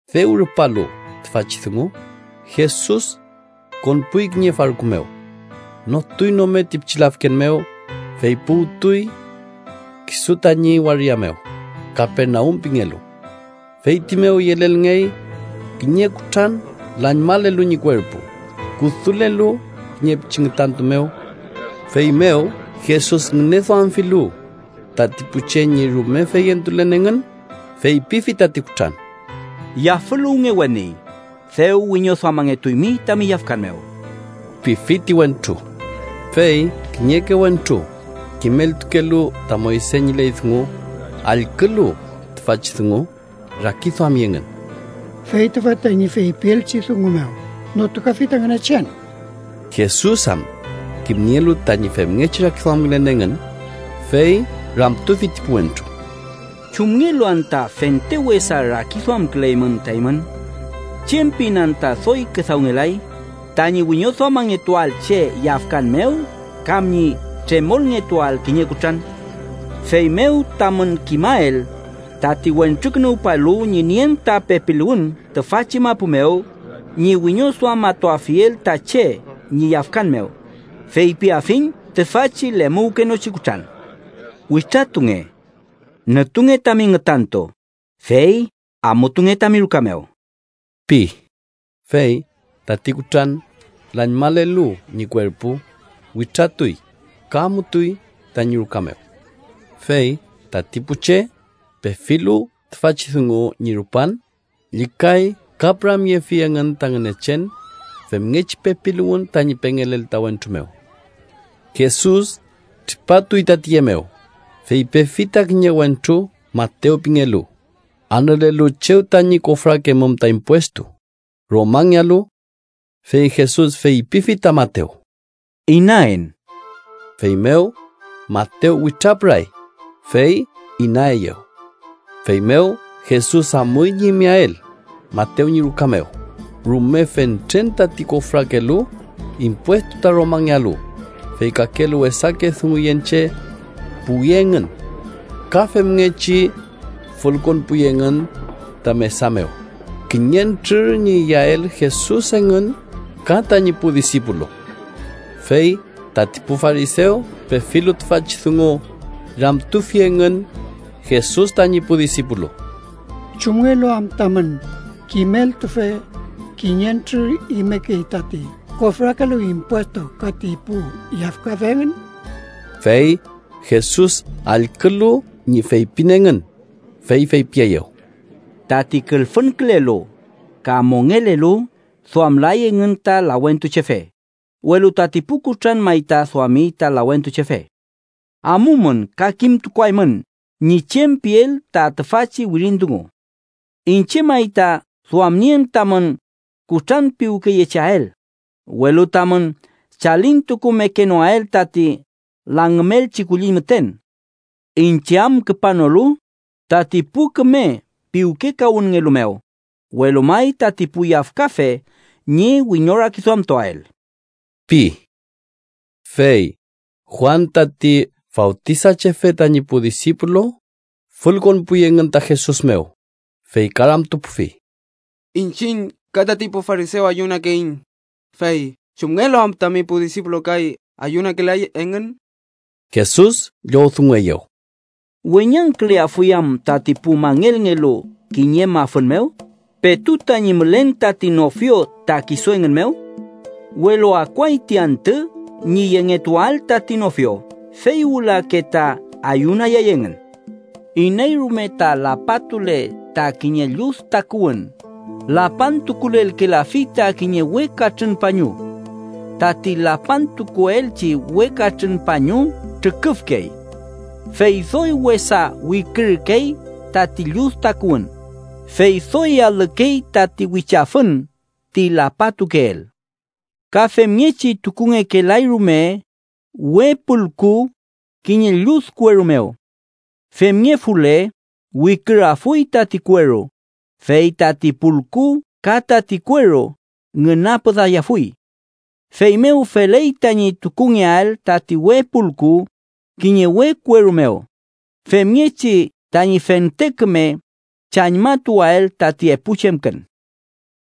Dew rupalu tüfachi dungu, Jesus konpuy kiñe farku mew. Notuy nome ti pichi lafken mew, fey puwtuy kisu tañi waria mew, Kapernaum pingelu. Feyti mew yelelngey kiñe kutran lañmalelu ñi kuerpu, kudulelu kiñe pichi ngütantu mew. Feymew Jesus ngüneduamfilu tati pu che ñi rume feyentulen engün, feypifi tati kutran: —Yafüluwnge, weni. Dew wiñoduamangetuymi tami yafkan mew ―pifi ti wentru. Fey kiñeke wentru kimeltukelu ta Moyse ñi ley dungu, allkülu tüfachi dungu, rakiduami engün: “Fey tüfa tañi feypielchi dungu mew notukafi ta Ngünechen.” Jesus am kimnielu tañi femngechi rakiduamkülen engün, fey ramtufi ti pu wentru: —¿Chumngelu anta fente wesa rakiduamküleymün ta eymün? ¿Chem pin anta doy küdawngelay? ¿Tañi wiñoduamangetuael che yafkan mew, kam ñi tremolngetuael kiñe kutran? Feymew tamün kimael tati Wentrukünuwpalu ñi nien ta pepiluwün tüfachi mapu mew ñi wiñoduamatuafiel ta che ñi yafkan mew, feypiafiñ tüfachi lemuwkenochi kutran: —Witratunge. Nütunge tami ngütantu, fey amutunge tami ruka mew ―pi. Fey tati kutran, lañmalelu ñi kuerpu, witratuy ka amutuy tañi ruka mew. Fey tati pu che, pefilu tüfachi dungu ñi rupan, llükay ka püramyefi engün ta Ngünechen femngechi pepiluwün tañi pengelel ta wentru mew. Jesus tripatuy ta tiye mew, fey pefi ta kiñe wentru Matew pingelu, anülelu chew tañi kofrakemum ta impuestu Romangealu. Fey Jesus feypifi ta Matew: —Inaen. Feymew Matew witrapüray, fey inaeyew. Feymew Jesus amuy ñi imeael Matew ñi ruka mew, rume fentren tati kofrakelu impuestu ta Romangealu, fey kakelu wesake dunguyen che puwi engün. Ka femngechi fülkonpuy engün ta mesa mew kiñentrür ñi iyael Jesus engün ka tañi pu disipulu. Fey tati pu farisew, pefilu tüfachi dungu, ramtufi engün Jesus tañi pu disipulu: —¿Chumngelu am tamün kimeltufe kiñentrür imekey tati kofrakelu impuestu ka ti pu yafkafe engün? Fey Jesus allkülu ñi feypin engün, fey feypieyew: —Tati külfünkülelu ka mongelelu duamlay engün ta lawentuchefe, welu tati pu kutran may ta duami ta lawentuchefe. Amumün ka kimtukuaymün ñi chem piel ta tüfachi wirin dungu: ‘Iñche may ta duamnien tamün kutranpiwkeyecheael, welu tamün chalintukumekenoael tati langümelchi kulliñ müten.’ Iñche am küpanolu tati pu küme piwkekawünnngelu mew, welu may tati pu yafkafe ñi wiñorakiduamtuael ―pi. Fey Juan tati Fawtisachefe tañi pu disipulu fülkonpuy engün ta Jesus mew, fey ka ramtupufi: —Iñchiñ ka tati pu farisew ayunakeiñ, fey ¿chumngelu am tami pu disipulu kay ayunakelay engün? Jesus llowdungueyew: —¿Weñangküleafuy am tati pu mangelngelu kiñe mafün mew, petu tañi mülen tati nofio ta kisu engün mew? Welu akuay ti antü ñi yengetuael tati nofio, fey wülake ta ayunayay engün. Iney rume ta lapatule ta kiñe llud takuwün, lapantukulelkelafi ta kiñe we katrün pañu. Tati lapantukuelchi we katrün pañu trüküfkey, fey doy wesa wikürkey tati llud takuwün, fey doy alükey tati wichafün ti lapatukeel. Ka femngechi tukungekelay rume we pulku kiñe llud kueru mew. Femngefule, wikürafuy tati kueru, fey tati pulku ka tati kueru ngünapüdayafuy. Feymew feley tañi tukungeael tati we pulku kiñe we kueru mew, femngechi tañi fente küme chañmatuael tati epu chemkün.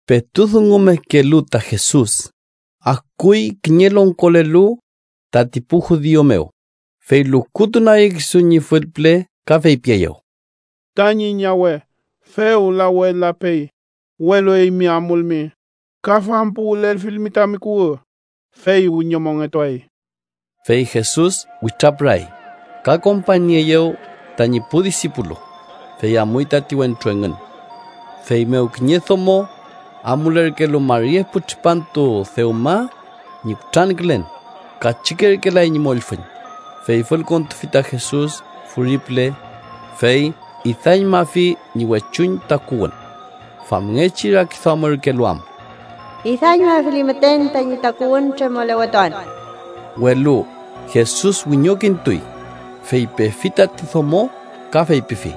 Petu dungumekelu ta Jesus, akuy kiñe longkolelu tati pu judiu mew, fey lukutunagi kisu ñi fülpüle ka feypieyew: —Tañi ñawe fewla we lapey, welu eymi amulmi ka fampuwülelfilmi tami kuwü, fey wiñomongetuay. Fey Jesus witrapüray, ka kompañnieeyew tañi pu disipulu, fey amuy tati wentru engün. Feymew kiñe domo amulerkelu mari epu tripantu dewma ñi kutrankülen, kachükerkelay ñi mollfüñ, fey fülkontufi ta Jesus furi püle, fey idañmafi ñi wechuñ takuwün. Famngechi rakiduamürkelu am: “Idañmafili müten tañi takuwün, tremolewetuan.” Welu Jesus wiñokintuy, fey pefi tati domo ka feypifi: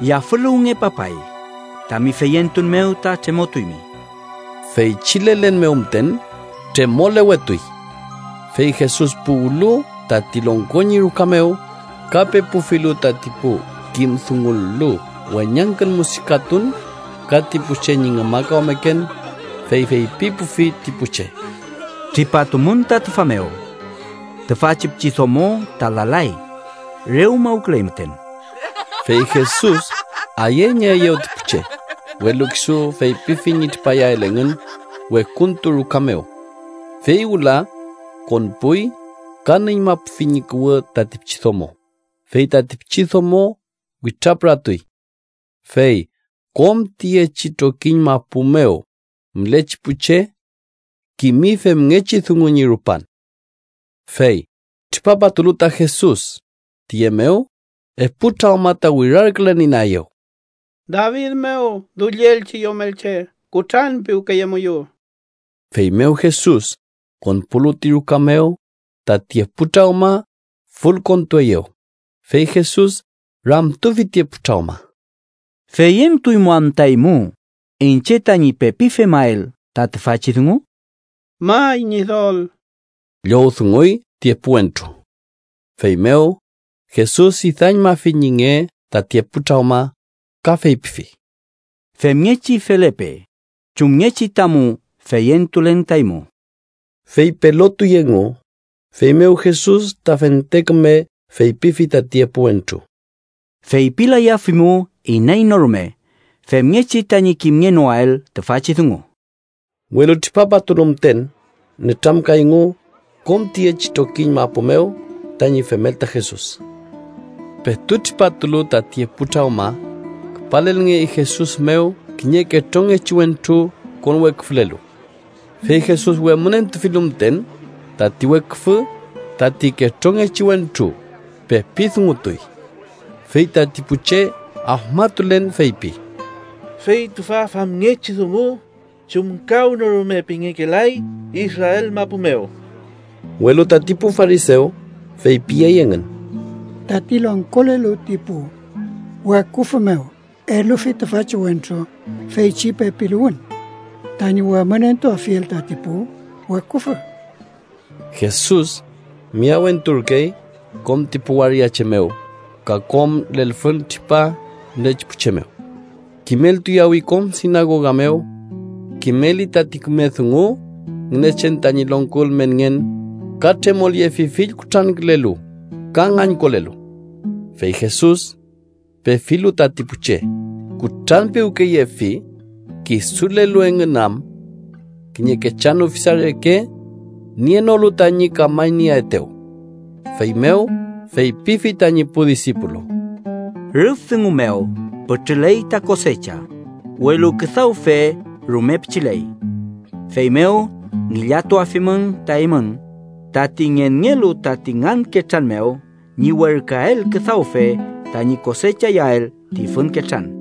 —Yafüluwnge, papay. Tami feyentun mew ta tremotuymi. Feychi lelen mew müten tremolewetuy. Fey Jesus puwlu tati longko ñi ruka mew, ka pepufilu tati pu kim dungulu weñangkün musikatun ka ti pu che ñi ngümakawmeken, fey feypipufi ti pu che: —Tripatumün ta tüfa mew. Tüfachi pichidomo ta lalay. Re umawküley müten. Fey Jesus ayeñeeyew ti pu che, welu kisu feypifi ñi tripayael engün wekuntu ruka mew. Fey wüla konpuy ka nüñmapufi ñi kuwü tati pichidomo, fey tati pichidomo witrapüratuy. Fey kom tiyechi trokiñ mapu mew mülechi pu che kimi femngechi dungu ñi rupan. Fey tripapatulu ta Jesus tiye mew, epu trawma ta wirarkülen inaeyew: —¡David mew dullielchi Yomelche, kutranpiwkeyemuyu! Feymew Jesus konpulu ti ruka mew, tati epu trawma fülkontueyew, fey Jesus ramtufi ti epu trawma: —¿Feyentuymu anta eymu iñche tañi pepi femael ta tüfachi dungu? —May, Ñidol ―llowdunguy ti epu wentru. Feymew Jesus idañmafi ñi nge tati epu trawma, ka feypifi: —Femngechi felepe chumngechi tamu feyentulen ta eymu. Fey pelotuy engu. Feymew Jesus ta fente küme feypifi tati epu wentru: —Feypilayafimu iney no rume femngechi tañi kimngenoael tüfachi dungu. Welu, tripapatulu müten, nütramkayngu kom tiyechi trokiñ mapu mew tañi femel ta Jesus. Petu tripatulu tati epu trawma, küpalngey Jesus mew kiñe ketrongechi wentru konweküfülelu. Fey Jesus wemünentufilu müten tati weküfü, tati ketrongechi wentru pepi dungutuy. Fey tati pu che afmatulen feypi: —¡Fey tüfa famngechi dungu chumkawnorume pengekelay Israel mapu mew! Welu tati pu farisew feypiyey engün: —Tati longkolelu ti pu weküfü mew elufi tüfachi wentru feychi pepiluwün tañi wemünentuafiel tati pu weküfü. Jesus miyawenturkey kom ti pu waria che mew ka kom lelfüntripa mülechi pu che mew. Kimeltuyawi kom sinagoga mew. Kimeli tati küme dungu Ngünechen tañi longko ülmenngen, ka tremolyefi fill kutrankülelu ka ngañkolelu. Fey Jesus pefilu tati pu che, kutranpiwkeyefi kisulelu engün am kiñe kechan ufisa reke nienolu tañi kamañnieaetew. Feymew feypifi tañi pu disipulu: —Rüf dungu mew pütrüley ta kosecha, welu küdawfe rume pichiley. Feymew ngillatuafimün ta eymün tati ngenngelu tati ngan ketran mew ñi werküael küdawfe tañi kosechayael ti fün ketran.